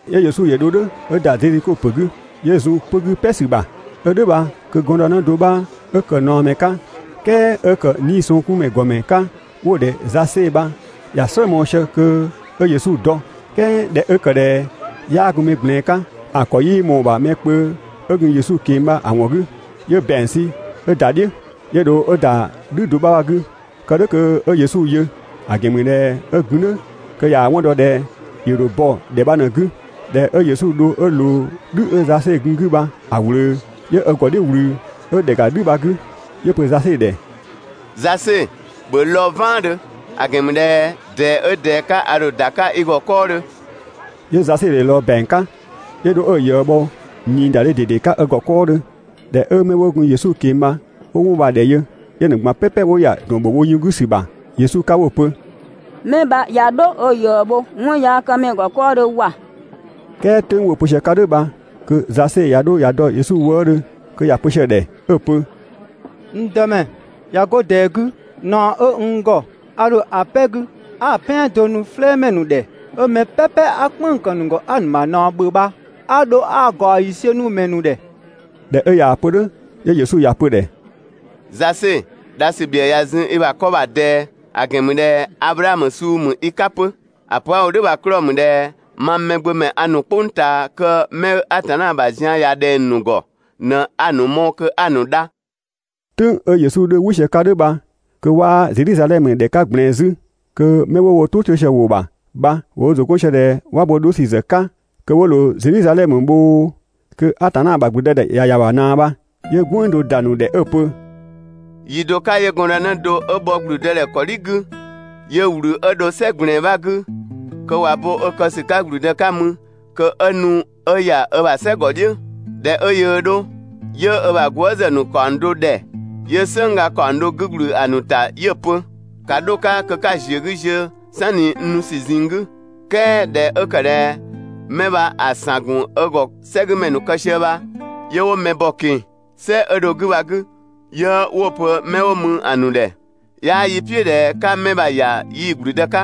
'Yö Yesu ‑yö ‑dho "dhʋ̈ 'ö ‑da Zedhiko ‑pö 'gü, 'yö zun 'pö‑ 'gü "pɛ ‑sü ‑bha. 'Ö "dhʋ̈ bha kö gɔndënë do 'bha 'ö ‑kë ꞊naɔmɛ 'ka, "kɛɛ 'ö ‑kë 'niisɔngkunmɛ ‑gɔmɛ 'ka 'wo‑ ‑dhɛ Zase bha ‑ya "slë mɔɔ‑ sië kö 'ö Yesu dɔ. "Kɛɛ ꞊dhɛ 'ö ‑kë ꞊dhɛ 'yaa gun mɛ ꞊gblɛɛn 'ka, ‑a ‑kɔ 'yii ꞊mɔɔ‑ ‑bha mɛ kpö 'ö gun Yesu ꞊keng‑ bha‑ ‑wɔn 'gü. 'Yö ‑bɛang sü 'ö ‑da "dhiʋ̈, 'yö dho ö ‑da "dhü do 'bha bha‑ 'gü, kë "dhʋ̈ kö 'ö Yesu yö; ‑a ‑gɛn ‑mü ꞊dhɛ 'ö gun "dhʋ̈ kö ꞊yaa‑ 'wɔn dɔ ꞊dhɛ ‑yö ‑dho bɔ ‑dhɛ bha ꞊në‑ 'gü. ꞊Dhɛ 'ö Yesu dho 'ö ꞊loo "dhü 'ö Zase gun‑ 'gü bha‑ ꞊wlöö, 'yö ö ‑gɔ "dhiʋ̈ ꞊wlü 'ö ‑dhɛ ‑ga "dhü bha‑ 'gü, 'yö‑ pö Zase ‑dhɛ: «Zase, ‑bhö lɔɔ‑ "vaandhö, ‑a ‑gɛn ‑mü ꞊dhɛ ꞊dɛɛ 'ö ꞊dɛɛ 'ka a ‑dho ‑da 'ka i ‑gɔ 'kɔɔdhö.» 'Yö Zase ‑yö ꞊lɔɔ ‑bɛang 'ka, 'yö dho 'ö‑ ꞊yëë bho ꞊niidadhe ꞊dede 'ka ö ‑gɔ 'kɔɔdhö. ꞊Dhɛ 'ö 'mɛ 'wo gun Yesu ꞊keng‑ bha 'wo 'wɔn bha‑ ‑dhɛ yö, 'yö‑ ‑nu ꞊gban "pɛpɛ 'wo ‑ya ‑dɔn ‑bho wo yun 'gü ‑sü ‑bha Yesu 'ka 'wo‑ pö: «'Mɛ bha ꞊ya 'dho ö ꞊yëë bho 'wɔnyaakëmɛ ‑gɔ 'kɔɔdhö ‑wa!» "Kɛɛ "tʋ̈ng 'wo‑ pö sië 'ka "dhʋ̈ bha kö Zase ꞊ya 'dho ꞊ya dɔ Yesu wëëdhö kö ‑ya pö sië‑ ‑dhɛ 'ö‑ pö: «N Dëmɛ, ꞊ya 'go ꞊dɛɛ 'gü, ꞊naɔ 'ö n ‑gɔ a ‑dho ‑a "pɛ 'gü 'a‑ "pɛan do nu "flɛɛmɛ ‑nu ‑dhɛ, 'ö mɛ "pɛpɛ 'a "kpënng‑ ‑kë ‑nu ‑gɔ 'a‑ ‑nu ‑bha ꞊naɔ ‑bhö bha 'a dho 'a‑ ‑gaɔ ‑yiisiö nu‑ ‑mɛ ‑nu ‑dhɛ.» ꞊Dhɛ 'ö ꞊yaa‑ pö "dhʋ̈, 'yö Yesu ‑ya pö‑ ‑dhɛ: «Zase, dha ‑sü ‑bhiëë ꞊ya zun i ‑bha 'kɔ ‑bha ꞊dɛɛ, ‑a ‑gɛn ‑mü ꞊dhɛ Ablaamö suu ‑mü i 'ka 'pö. ‑A pö 'a‑ wo "dhʋ̈ bha‑ 'klɔɔ‑ ‑mü ꞊dhɛ mang Mɛgbömɛ a ‑nu "kpʋng ꞊taa kö 'mɛ 'ö Atanna ‑bha zian ꞊ya ꞊dhɛng‑ ‑nu ‑gɔ ꞊në 'a‑ ‑nu mɔɔ‑ kö 'a‑ ‑nu dha.» "Tʋ̈ng 'ö Yesu 'dhö "wɩ sië‑ 'ka "dhʋ̈ bha kö 'waa Zedhizadhɛmö ‑dhɛ 'ka ꞊gblɛɛn 'zü, kö 'mɛ 'wo wo "tʋ 'to sië‑ ‑wʋ ‑bha bha ‑wo wo ‑zʋ 'gɔn sië ꞊dhɛ 'wa bo 'dho ‑sü ‑zë 'ka kö 'wo ꞊loo Zedhizadhɛmö bhoo, kö Atanna ‑bha ‑gblüdëdhɛ ꞊ya ‑ya ‑bha ꞊naa bha. 'Yö "gwënng do ‑da ‑nu ‑dhɛ 'ö‑ pö: «Yi do 'ka 'yö gɔndënë do 'ö bhɔ ‑gblüdëdhɛ ‑kɔdhi 'gü, 'yö ꞊wlü 'ö dho "sɛ ꞊gblɛɛn 'bha 'gü kö ꞊wa bo ö kë ‑sü 'ka ‑gblüdë 'ka mü kö 'ö nu 'ö ‑ya ö ‑bha "sɛ ‑gɔ "dhiʋ̈. ꞊Dhɛ 'ö yöö 'dho, 'yö ö ‑bha gwëëzë ‑nu ‑kaɔng do ‑dhɛ, 'yö "sënng ga ‑kaɔng do 'gü ‑gblü ‑a ‑nu ‑ta 'yö‑ pö: «‑Ka 'dho‑ 'ka kö 'ka‑ ‑ziö 'gü ziö "sanni n nu ‑sü ꞊zinng 'gü.» "Kɛɛ ꞊dhɛ 'ö ‑kë ꞊dhɛ 'mɛ bha‑ ‑san ‑gun ö ‑gɔ "sɛgümɛ ‑nu kë sië bha, 'yö 'wo mɛ bɔ‑ ꞊keng‑ "sɛ 'ö dho‑ 'gü bha‑ 'gü, 'yö 'wo‑ pö 'mɛ 'wo mü‑ ‑nu ‑dhɛ: «'Yaa yi "piʋ̈ ꞊dhɛ 'ka 'mɛ bha‑ ‑ya yii‑ ‑gblüdë 'ka.»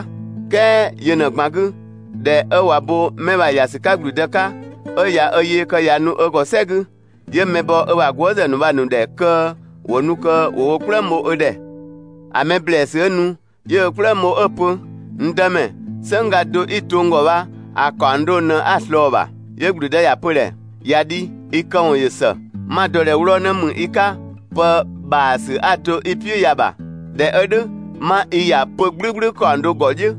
"Kɛɛ yö ꞊në‑ ꞊gban‑ 'gü, ꞊dhɛ 'ö ꞊wa bo 'mɛ bha‑ ‑ya ‑sü 'ka ‑gblüdë 'ka, 'ö ꞊ya ö yee kë ꞊ya nu ö ‑gɔ "sɛ 'gü, 'yö mɛ bɔ ö ‑bha gwëëzë ‑nu bha‑ ‑nu ‑dhɛ kö ‑wo nu kö ‑wo wo "kplëng bho ö ‑dhɛ. ‑A mɛ ‑blɛɛsü 'ö nu, 'yö ö "kplëng bho 'ö‑ pö: «N Dëmɛ, "sënng ga do 'i‑ to n ‑gɔ bha, ‑a ‑kaɔng do ꞊në 'a‑ ꞊slɔɔ‑ ‑bha.» 'Yö ‑gblüdë ‑ya pö‑ ‑dhɛ: «꞊Ya dhi, i këwɔn ‑yö ‑së. 'Ma‑ dɔ ꞊dhɛ 'wlɔɔ‑ 'në ‑mü i 'ka pë ‑bhaasü 'a‑ to i "piʋ̈ ya‑ ‑bha. ꞊Dhɛ 'ö "dhʋ̈, 'ma i ‑ya 'pö‑ "gblʋ̈gblʋ̈ ‑kaɔng do ‑gɔ "dhiʋ̈.»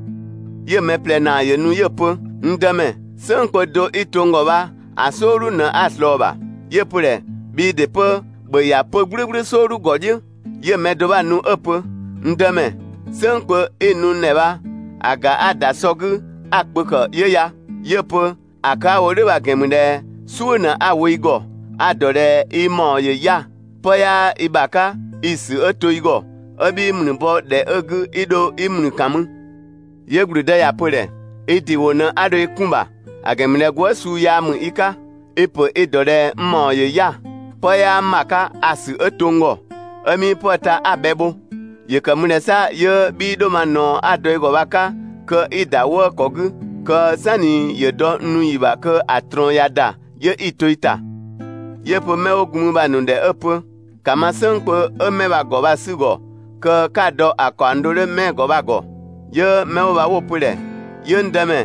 'Yö mɛ ꞊plɛ ‑naa ‑yö nu 'yö‑ pö: «N Dëmɛ, "sënng kpö do 'i‑ to n ‑gɔ bha, ‑a "sɔɔdhu ꞊në 'a‑ ꞊slɔɔ‑ ‑bha.» 'Yö‑ pö‑ ‑dhɛ: «Bhii ‑dɩ 'pö, ‑bhö ‑ya 'pö‑ "gblʋ̈gblʋ̈ "sɔɔdhu ‑gɔ "dhiʋ̈.» 'Yö‑ mɛ do 'bha‑ nu 'ö‑ pö: «N Dëmɛ, "sënng kpö 'i‑ nu n ‑dhɛ bha, ‑a ‑ga 'a‑ ‑da sɔ 'gü 'a kpö ‑kë 'ö ya.» 'Yö‑ pö: «‑A kë 'a‑ wo "dhʋ̈ bha‑ ‑gɛn ‑mü ꞊dhɛ "suʋ̈ ꞊në 'a‑ wo i ‑gɔ, a‑ ‑dɔ ꞊dhɛ i ‑mawɔn ‑yö 'ya‑, 'pë 'yaa i ‑bha 'ka 'i‑ ‑sü 'ö to i ‑gɔ, 'ö 'bhii ‑mlü bɔ ‑dhɛ 'ö‑ 'gü 'i dho 'i ‑mlü ‑kan mü.» 'Yö ‑gblüdë ‑ya pö‑ ‑dhɛ: «I ‑dɩ ‑wʋ ꞊në 'a dho i 'kun‑ ‑bha, ‑a ‑gɛn ‑mü ꞊dhɛ gwëë" suu yaa ‑mü i 'ka. I‑ ‑pö i‑ ‑dɔ ꞊dhɛ n ‑mawɔn ‑yö 'ya‑, 'pë 'yaa n ‑bha 'ka, a‑ ‑sü 'ö to n ‑gɔ, 'ö 'mii 'pëë‑ ta 'a‑ bhɛ bho, ‑yö ‑kë ‑mü ꞊dhɛ 'sa 'yö 'bhii 'dho ma ꞊naɔ 'a‑ dɔ i ‑gɔ bha‑ 'ka kö 'i‑ ‑da 'wëë‑ ‑kɔ 'gü, kö "sanni ‑yö dɔ n nu ‑yi ‑bha kö ‑a ꞊trɔɔn ꞊ya ‑da, 'yö i‑ to i ‑ta?» 'Yö‑ pö 'mɛ 'wo gun mü bha‑ ‑nu ‑dhɛ 'ö‑ pö: «‑Ka ma "sënng kpö 'ö 'mɛ bha‑ ‑gɔ bha‑ 'sü‑ ‑gɔ kö 'ka‑ dɔ‑ ‑kaɔng do 'dhö 'mɛ‑ ‑gɔ bha‑ ‑gɔ.» 'Yö 'mɛ 'wo bha 'wo‑ pö‑ ‑dhɛ: «'Yö n Dëmɛ,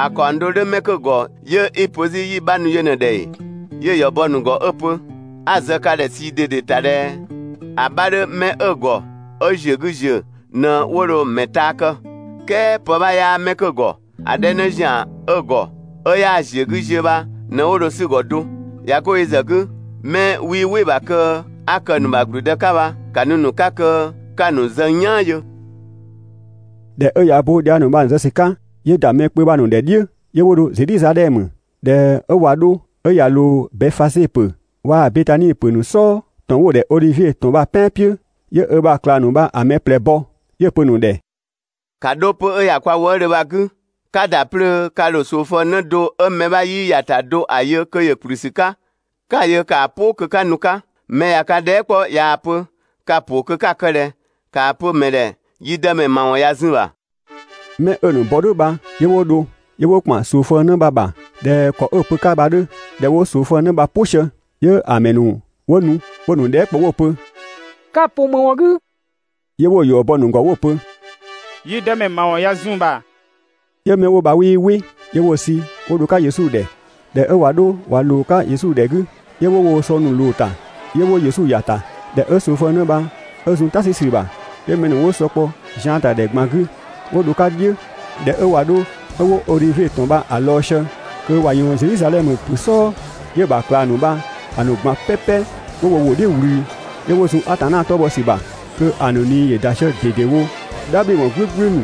‑a ‑kaɔng do 'dhö 'mɛ 'kö‑ ‑gɔ 'yö 'i‑ pö 'zü 'yi‑ 'bha nu yö ꞊në‑ ‑dhɛ ‑ee?» 'Yö‑ ‑yɔ bɔ‑ ‑nu ‑gɔ 'ö‑ pö: «'A‑ zë ka ‑dhɛ ꞊sii ꞊dede ‑ta ꞊dhɛ: ‑A 'bha 'dhö 'mɛ 'ö‑ ‑gɔ 'ö‑ ‑ziö 'gü ‑ziö ꞊në 'wo dho‑ ‑mɛ taa kë, "kɛɛ pë 'bha 'yaa 'mɛ 'kö‑ ‑gɔ, ‑a 'dhɛ 'në ‑zian 'ö‑ ‑gɔ ('ö 'yaa‑ ‑ziö 'gü ziö) bha ꞊në 'wo dho‑ 'sü‑ ‑gɔ do. ꞊Ya 'go yö ‑zë 'gü, 'mɛ 'wii "wɩ‑ ‑bha kö 'a kë‑ ‑nu ‑bha ‑gblüdë 'ka bha, ‑ka nu‑ ‑nu 'ka kö 'ka‑ ‑nu zë n "yaan yö!» ꞊Dhɛ 'ö ꞊ya ö bo dhiang ‑nu bha‑ ‑nu zë ‑sü 'ka, 'yö ‑da mɛ kpö bha‑ ‑nu ‑dhɛ "dhiʋ̈, 'yö 'wo dho Zedhizadhɛmö. ꞊Dhɛ 'ö ꞊wa 'dho 'ö ꞊ya ꞊loo Bɛfaze ‑pö waa‑ Betani ‑pö ‑nu "sɔɔ, ‑tɔn 'wo‑ ‑dhɛ Odhivie ‑tɔn bha‑ "pɛan "piʋ̈, 'yö ö ‑bha ꞊klang ‑nu bha‑ mɛ ꞊plɛ bɔ, 'yö‑ pö‑ ‑nu ‑dhɛ: «‑Ka 'dho 'pö‑ 'ö ‑ya kwa wëëdhö bha‑ 'gü. 'Ka ‑da 'plöö ka ‑dho ꞊soofëng 'në do 'ö mɛ 'bha 'yii ‑ya ‑ta do ‑a yö kö ‑yö ‑kplü ‑sü 'ka, 'ka‑ yö ‑kaa "pʋ kö 'ka nu‑ 'ka. Mɛ ꞊ya ka dhɛɛ" 'kpɔ ꞊yaa‑ pö: «Ka‑ ‑pʋ kö 'ka‑ kë ꞊dhɛ?», ‑kaa pö‑ ‑mɛ ‑dhɛ: «Yi dëmɛ ‑mawɔn ꞊ya zun‑ ‑bha.» 'Mɛ 'ö‑ ‑nu bɔ "dhʋ̈ bha 'yö 'wo dho. 'Yö 'wo ‑kpan ꞊soofëng 'në bha‑ ‑bha ꞊dhɛ ‑kɔ 'ö‑ pö‑ 'ka bha‑ 'dhö. ꞊Dhɛ 'wo ꞊soofëng 'në bha‑ "pʋ sië, 'yö‑ ‑mɛ ‑nu ‑wo nu 'wo‑ ‑nu dhɛɛ" kpɔ 'wo‑ pö: «Ka‑ ‑pʋ ‑më ‑wɔn 'gü?» 'Yö 'wo‑ ‑yɔ bɔ‑ ‑nu ‑gɔ 'wo‑ pö: «Yi Dëmɛ ‑mawɔn ꞊ya zun‑ ‑bha.» 'Yö 'mɛ 'wo bha 'wii "wɩ. 'Yö 'wo‑ sü 'wo dho‑ 'ka Yesu ‑dhɛ. ꞊Dhɛ 'ö ꞊wa 'dho ꞊wa ꞊loo‑ 'ka Yesu ‑dhɛ 'gü, 'yö 'wo woo‑ sɔ ‑nu ꞊loo‑ ‑ta, 'yö 'wo Yesu ‑ya ‑ta. ꞊Dhɛ 'ö ꞊soofëng 'në bha 'ö zun "ta 'sü ‑sü ‑bha, 'yö mɛ ‑nu 'wo sɔ kpɔ zian ‑ta ‑dhɛ ꞊gban 'gü 'wo dho‑ 'ka "dhiʋ̈. ꞊Dhɛ 'ö ꞊wa 'dho 'ö 'wo Odhivie ‑tɔn bha‑ lɔɔ‑ sië 'kö ꞊wa ꞊yɔɔn Zedhizadhɛmö ‑pö "sɔɔ, 'yö‑ ‑bha ꞊klang ‑nu bha‑ ‑nu ꞊gban "pɛpɛ 'wo wo ‑wʋ "dhiʋ̈ ꞊wlü, 'yö 'wo zun Atanna 'tɔ bhɔ ‑sü ‑bha kö ‑a ‑nu ꞊nii ‑yö ‑da sië ꞊dedewo "dhabhliwɔn "gblʋ̈gblʋ̈ ‑nu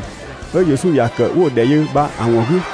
'ö Yesu ‑ya ‑kë 'wo‑ ‑dhɛ yö bha‑ ‑wɔn 'gü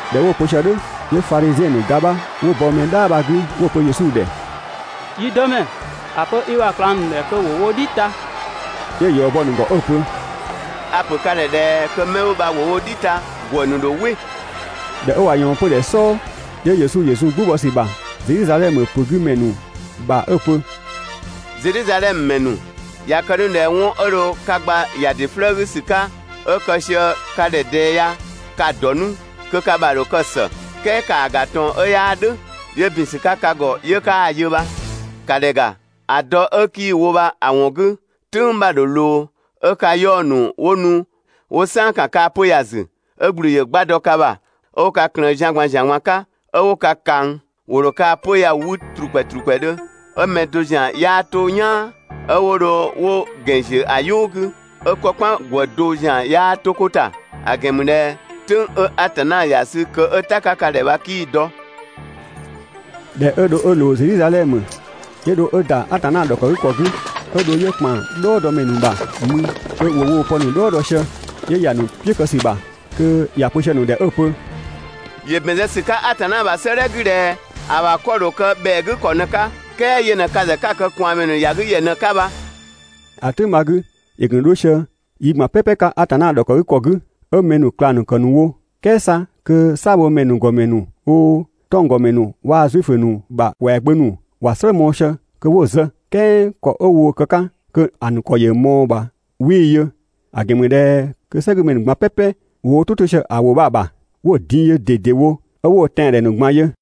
꞊Dhɛ 'wo‑ pö sië "dhʋ̈, 'yö Fadhiziɛn ‑nu ga bha ‑wo bɔ mɛ "dhaa bha‑ 'gü 'wo‑ pö Yesu ‑dhɛ: «Yi Dëmɛ, ‑a pö i ‑bha ꞊klang ‑nu ‑dhɛ kö ‑wo wo "dhi ta!» 'Yö‑ ‑yɔ bɔ‑ ‑nu ‑gɔ 'ö‑ pö: ««A‑ ‑pö ka ‑dhɛ ꞊dhɛ kö 'mɛ 'wo bha ‑wo wo "dhi ta, ‑gwë ‑nu ‑dho "wɩ!» ꞊Dhɛ 'ö ꞊wa ꞊yɔɔn 'pödhɛ "sɔɔ, 'yö Yesu zun "gbʋ bɔ ‑sü ‑bha Zedhizadhɛmö ‑pö 'gü ‑mɛ ‑nu bha 'ö‑ pö: «Zedhizadhɛmö ‑mɛ ‑nu, ꞊ya kë 'nu ꞊dhɛ 'wɔn 'ö dho ka gba ‑ya ‑dɩ 'flëë‑ 'gü ‑sü 'ka, 'ö kë sië ka ‑dhɛ ꞊dɛɛ ya, ka‑ ‑dɔ 'nu, kö ka ‑bha ‑dho kë ‑së. "Kɛɛ ‑kaa ‑ga ꞊tɔn 'ö 'yaa "dhʋ̈, 'yö ‑bin ‑sü 'ka ka ‑gɔ 'yö 'kaa‑ yö bha. ‑Ka ‑dhɛ ‑ga, ‑a dɔ 'ö 'kii‑ wo bha‑ ‑wɔn 'gü, "tʋ̈ng 'bha ‑dho ꞊loo 'ö ka 'yaɔ‑ ‑nu 'wo nu 'wo "saan ‑kan kaa‑ 'pö‑ ya‑ ‑zü, 'ö ‑gblü ‑yö 'gba dɔ ka ‑bha 'ö 'wo ka ꞊klëën zian ꞊gban ‑zian ꞊gban 'ka, 'ö 'wo ka ꞊kang. ‑Wo ‑dho kaa‑ 'pö‑ ya‑ 'wü ‑trukpɛ ‑trukpɛdhö, 'ö mɛ do ‑zian 'yaa 'to "yaan, 'ö 'wo dho 'wo wo ‑gɛn ‑ziö ‑a "yʋʋ 'gü, 'ö‑ 'kɔ "kpan ‑gwë do ‑zian 'yaa 'to 'ko ‑ta, ‑a ‑gɛn ‑mü ꞊dhɛ "tʋ̈ng 'ö Atanna ‑ya sü kö 'ö "ta‑ 'ka ka ‑dhɛ bha 'kii‑ dɔ.» ꞊Dhɛ 'ö dho 'ö ꞊loo Zedhizadhɛmö, 'yö dho 'ö ‑da Atanna ‑dhɔkëgükɔ 'gü, 'ö dho ‑yö ‑kpan "dhɔɔdɔmɛ ‑nu ‑bha mü kö ‑wo woo‑ pë 'në ‑nu "dhɔɔ dɔ sië. 'Yö ‑ya ‑a ‑nu "piʋ̈ kë ‑sü ‑bha kö ‑ya pö sië‑ ‑nu ‑dhɛ 'ö‑ pö: «‑Yö ‑bɛn zë ‑sü 'ka Atanna ‑bha 'sëëdhɛ 'gü ꞊dhɛ ‑a ‑bha 'kɔ‑ ‑dho kë ‑bhɛa 'gü ‑kɔ ꞊në‑ 'ka, "kɛɛ yö ꞊në ka ‑zë 'ka‑ kë ꞊kwaanmɛ ‑nu ‑ya 'gü ‑yɛ ꞊në‑ 'ka bha!» ‑A "tʋ̈ng bha‑ 'gü, ‑yö gun 'dho sië yi ꞊gban "pɛpɛ 'ka Atanna ‑dhɔkëgükɔ 'gü, 'ö mɛ ‑nu ꞊klang ‑nu ‑kë ‑nu wo, "kɛɛ 'sa kö "saabhomɛ ‑nu ‑gɔmɛ ‑nu oo, 'tɔnggɔmɛ ‑nu waa‑ Zuifö ‑nu ‑bha ‑kwɛagbö ‑nu ‑wa "slë mɔɔ‑ sië kö 'wo‑ zë. "Kɛɛ ‑kɔ 'ö woo‑ kë‑ 'ka kö‑ ‑nu ‑kɔ ꞊mɔɔ‑ ‑bha 'wii‑ yö, ‑a ‑gɛn ‑mü ꞊dhɛ kö "sɛgümɛ ‑nu ꞊gban "pɛpɛ ‑wo wo "tʋ 'to sië‑ ‑wʋ bha‑ ‑bha 'wo‑ din yö ꞊dedewo 'ö 'wo‑ tɛandhɛ ‑nu ꞊gban yö.